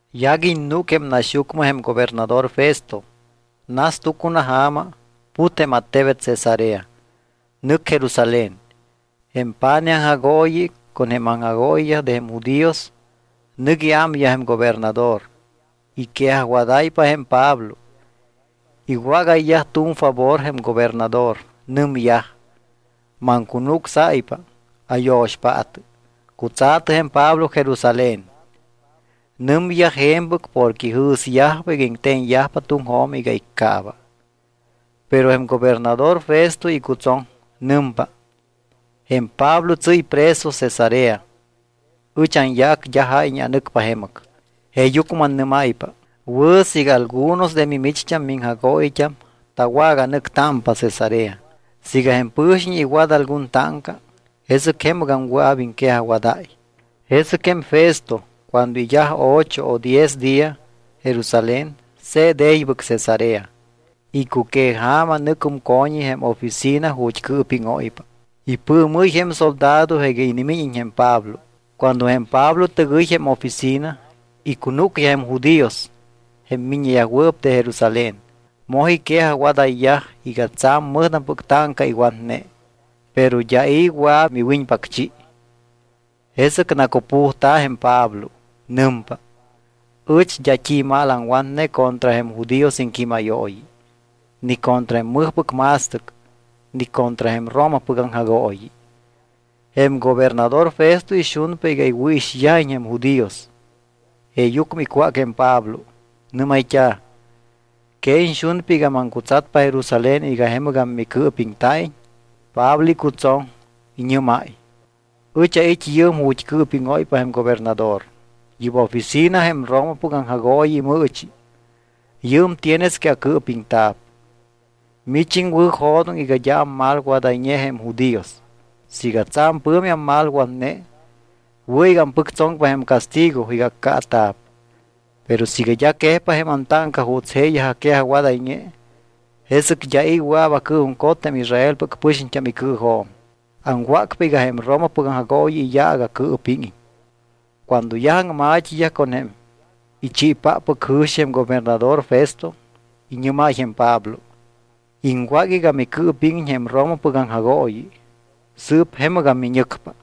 Yaguiñ núc jém naxyucmɨ jém gobernador Festo. Nas tucunaja̱ma, put jém attebet Cesarea, nɨc Jerusalén. Jém pa̱nij aŋjagooyiyaj con jém aŋjagooyiyaj de jém judíos, nɨc iámyaj jém gobernador. Iquejajwadáypa jém Pablo. Iwágayyaj tu̱m favor jém gobernador. Nɨmyaj: —Maŋcunucsáypa, ayo̱xpaatɨ, cutsa̱tɨ jém Pablo Jerusalén. Nɨmyaj je̱mpɨc porque ijɨ̱syajpa iga iŋte̱ñyajpa tuŋjo̱m iga iccaaba. Pero jém gobernador Festo icutsoŋ. Nɨmpa: —Jém Pablo tsɨ́y preso Cesarea. Ɨch anyaac d́a jáyñe anɨcpa jemɨc. Jeeyucmɨ mannɨ́máypa, wɨ̱ siiga algunos de mimicht́am miŋjagooyit́am tawaganɨctámpa Cesarea. Siiga jém pɨ̱xiñ iwat algun táŋca, jesɨc jemɨgam wɨa̱p iŋquejajwadáy. Jesɨc jém Festo cuando iyaj ocho o diez día Jerusalén, se̱t e̱ybɨc Cesarea. Icuqueja̱ma nɨcum co̱ñi jém oficina ju̱t́ cɨɨpíŋóypa. Ipɨɨmɨ́y jém soldado iga inimíñiñ jém Pablo. Cuando jém Pablo tɨgɨy jém oficina, icunúcyaj jém judíos, jém miññeyajwɨɨp de Jerusalén. Moj iquejajwadayyaj iga tsa̱m mɨjtampɨc táŋca iwatne. Pero d́a i̱ wɨa̱p miwiñpacchi. Jesɨc nacupujta̱p jém Pablo. Nɨmpa: —Ɨch d́a t́i mal aŋwatne contra jém judíos iŋquímayooyi, ni contra jém mɨjpɨc ma̱stɨc, ni contra jém Romapɨc aŋjagooyi. Jém gobernador Festo ixunpa iga iwɨ̱ixyajiñ jém judíos, jeeyucmɨ icwác jém Pablo, nɨ́mayt́a̱: —¿Que iñxunpa iga maŋcutsatpa Jerusalén iga jemɨgam micɨɨpiŋta̱iñ? Pablo icutsoŋ, iñɨ́máy: —Ɨch ait́ yɨɨm ju̱t́ cɨɨpíŋóypa jém gobernador. Yɨ́p oficina jém Romapɨc aŋjagooyi imɨɨchi. Yɨɨm tienes que acɨɨpiŋta̱p. Mich iŋwɨ̱jo̱doŋ iga d́a ammalwadayñe jém judíos. Siiga tsa̱m pɨ̱mi ammalwatne, wɨ̱ iga ampɨctsoŋpa jém castigo iga accaata̱p. Pero siiga d́a quejpa jém antáŋca juuts jeeyaj aquejajwadayñe, jesɨc d́a i̱ wɨa̱p acɨɨjuŋcot jém Israelpɨc pɨxiñt́am icɨɨjo̱m. Aŋwácpa iga jém Romapɨc aŋjagooyi iyaac acɨɨpíŋiñ. Cuando yaj aŋma̱t́iyaj con jém ichiipáppɨc jɨ̱xi jém gobernador Festo, iñɨ́máy jém Pablo: —Iŋwác iga micɨɨpíŋiñ jém Romapɨc aŋjagooyi, sɨɨp jemɨgam miñɨcpa.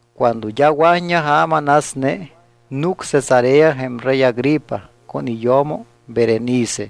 Cuando d́a wa̱t́ña ja̱ma nasne, núc Cesarea jém rey Agripa con iyo̱mo Berenice.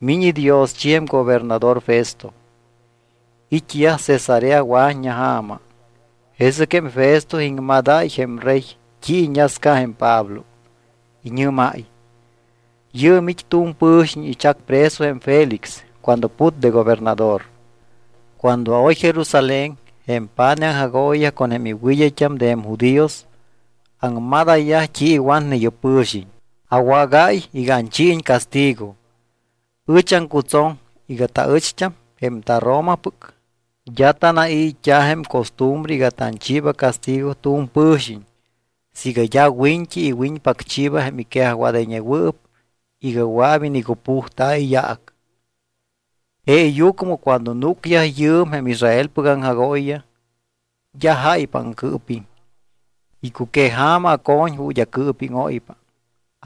Miñ idioschi jém gobernador Festo. It́yaj Cesarea wa̱t́ña ja̱ma. Jesɨc jém Festo iŋmadáy jém rey t́i iñasca jém Pablo. Iñɨ́máy: —Yɨɨm it́ tu̱m pɨ̱xiñ ichac preso jém Félix cuando put de gobernador. Cuando aoy Jerusalén jém pa̱nij aŋjagooyiyaj con jém iwɨd́ayt́am de jém judíos, aŋmadayyaj t́i iwatne yɨ́p pɨ̱xiñ. Awágáy iga anchiiñ castigo. Ɨch aŋcutsoŋ iga taɨcht́am jém taRomapɨc, d́a tanai̱t́a jém costumbre iga tanchiiba castigo tu̱m pɨ̱xiñ siiga d́a wiñt́i iwiñpacchiiba jém iquejajwadayñewɨɨp iga wɨa̱p inicupujta̱ iyaac. Jeeyucmɨ cuando núcyaj yɨɨm jém Israelpɨc aŋjagooyiyaj, d́a jáypa aŋcɨɨpiŋ. Icuqueja̱ma aco̱ñ ju̱t́ acɨɨpíŋóypa,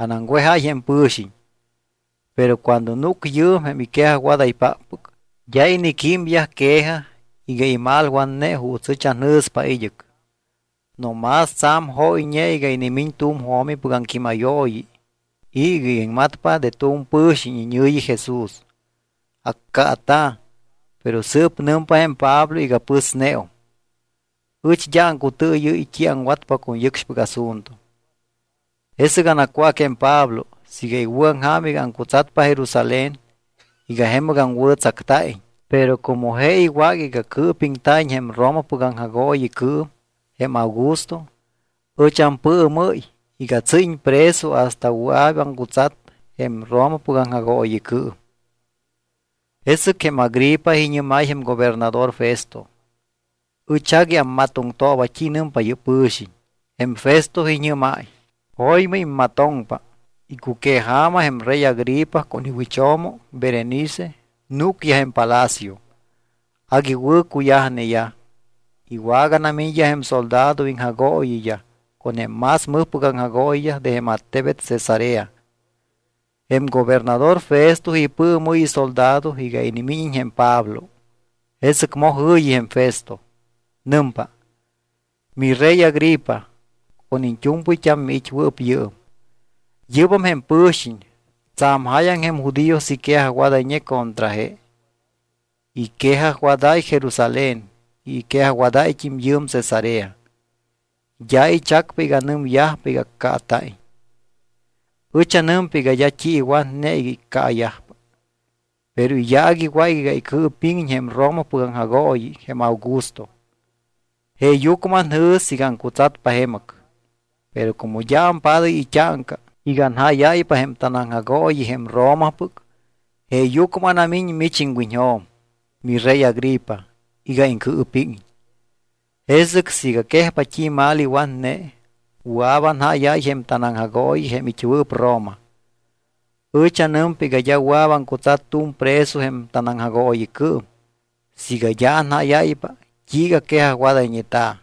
anaŋwejáy jém pɨ̱xiñ. Pero cuando núc yɨɨm jém iquejajwadaypáppɨc, d́a iniquímyaj quejaj iga imalwatne juuts ɨch anjɨ̱spa id́ɨc. No más tsa̱m jóyñe iga inimiñ tu̱m jo̱mipɨc aŋquímayooyi y iga iŋmatpa de tu̱m pɨ̱xiñ iñɨ̱yi Jesús. Accaata̱, pero sɨɨp nɨmpa jém Pablo iga pɨsneum. Ɨch d́a aŋcutɨɨyɨ́y t́i aŋwatpa con yɨcxpɨc asunto. Jesɨc anacwác jém Pablo siiga iwɨ̱aŋja̱m iga aŋcutsatpa Jerusalén iga jemɨgam wɨ̱tsacta̱iñ. Pero como je iwác iga cɨɨpiŋta̱iñ jém Romapɨc aŋjagooyicɨɨm, jém Augusto, ɨch ampɨɨmɨ́y iga tsɨ́yiñ preso hasta wɨa̱p aŋcutsat jém Romapɨc aŋjagooyicɨɨm. Jesɨc jém Agripa iñɨ́máy jém gobernador Festo: —Ɨch agui ammatoŋtooba t́i nɨmpa yɨ́p pɨ̱xiñ. Jém Festo iñɨ́máy: —Jo̱ymɨ immatoŋpa. Icuqueja̱ma jém rey Agripa con iwɨcho̱mo Berenice núcyaj jém palacio. Agui wɨ̱ cuyajneyaj. Iwaganamiñyaj jém soldado iŋjagooyiyaj con jém más mɨjpɨc aŋjagooyiyaj de jém attebet Cesarea. Jém gobernador Festo ipɨɨmɨ́y isoldado iga inimíñiñ jém Pablo. Jesɨc moj jɨ̱yi jém Festo. Nɨmpa: —Mirey Agripa, con iñt́u̱mpɨyt́am miit́wɨɨp yɨɨm. Yɨ́bam jém pɨ̱xiñ. Tsa̱m jáyaŋ jém judíos iquejajwadayñe contra je. Iquejajwadáy Jerusalén y iquejajwadáyt́im yɨɨm Cesarea. D́a ichacpa iga nɨmyajpa iga accaata̱iñ. Ɨch anɨmpa iga d́a t́i iwatne iga iccaayajpa. Pero iyaac iwác iga icɨɨpíŋiñ jém Romapɨc aŋjagooyi jém Augusto. Jeeyucmɨ anjɨ̱s iga aŋcutsatpa jemɨc. Pero como d́a ampádáy it́áŋca iga anjáyáypa jém tanaŋjagooyi jém Romapɨc, jeeyucmɨ anamiñ mich iŋwiñjo̱m, mirey Agripa, iga iŋcɨɨpíŋiñ. Jesɨc siiga quejpa t́i mal iwatne, wɨa̱p anjáyáy jém tanaŋjagooyi jém it́wɨɨp Roma. Ɨch anɨmpa iga d́a wɨa̱p aŋcutsat tu̱m preso jém tanaŋjagooyicɨɨm siiga d́a anjáyáypa t́iiga quejajwadayñeta̱.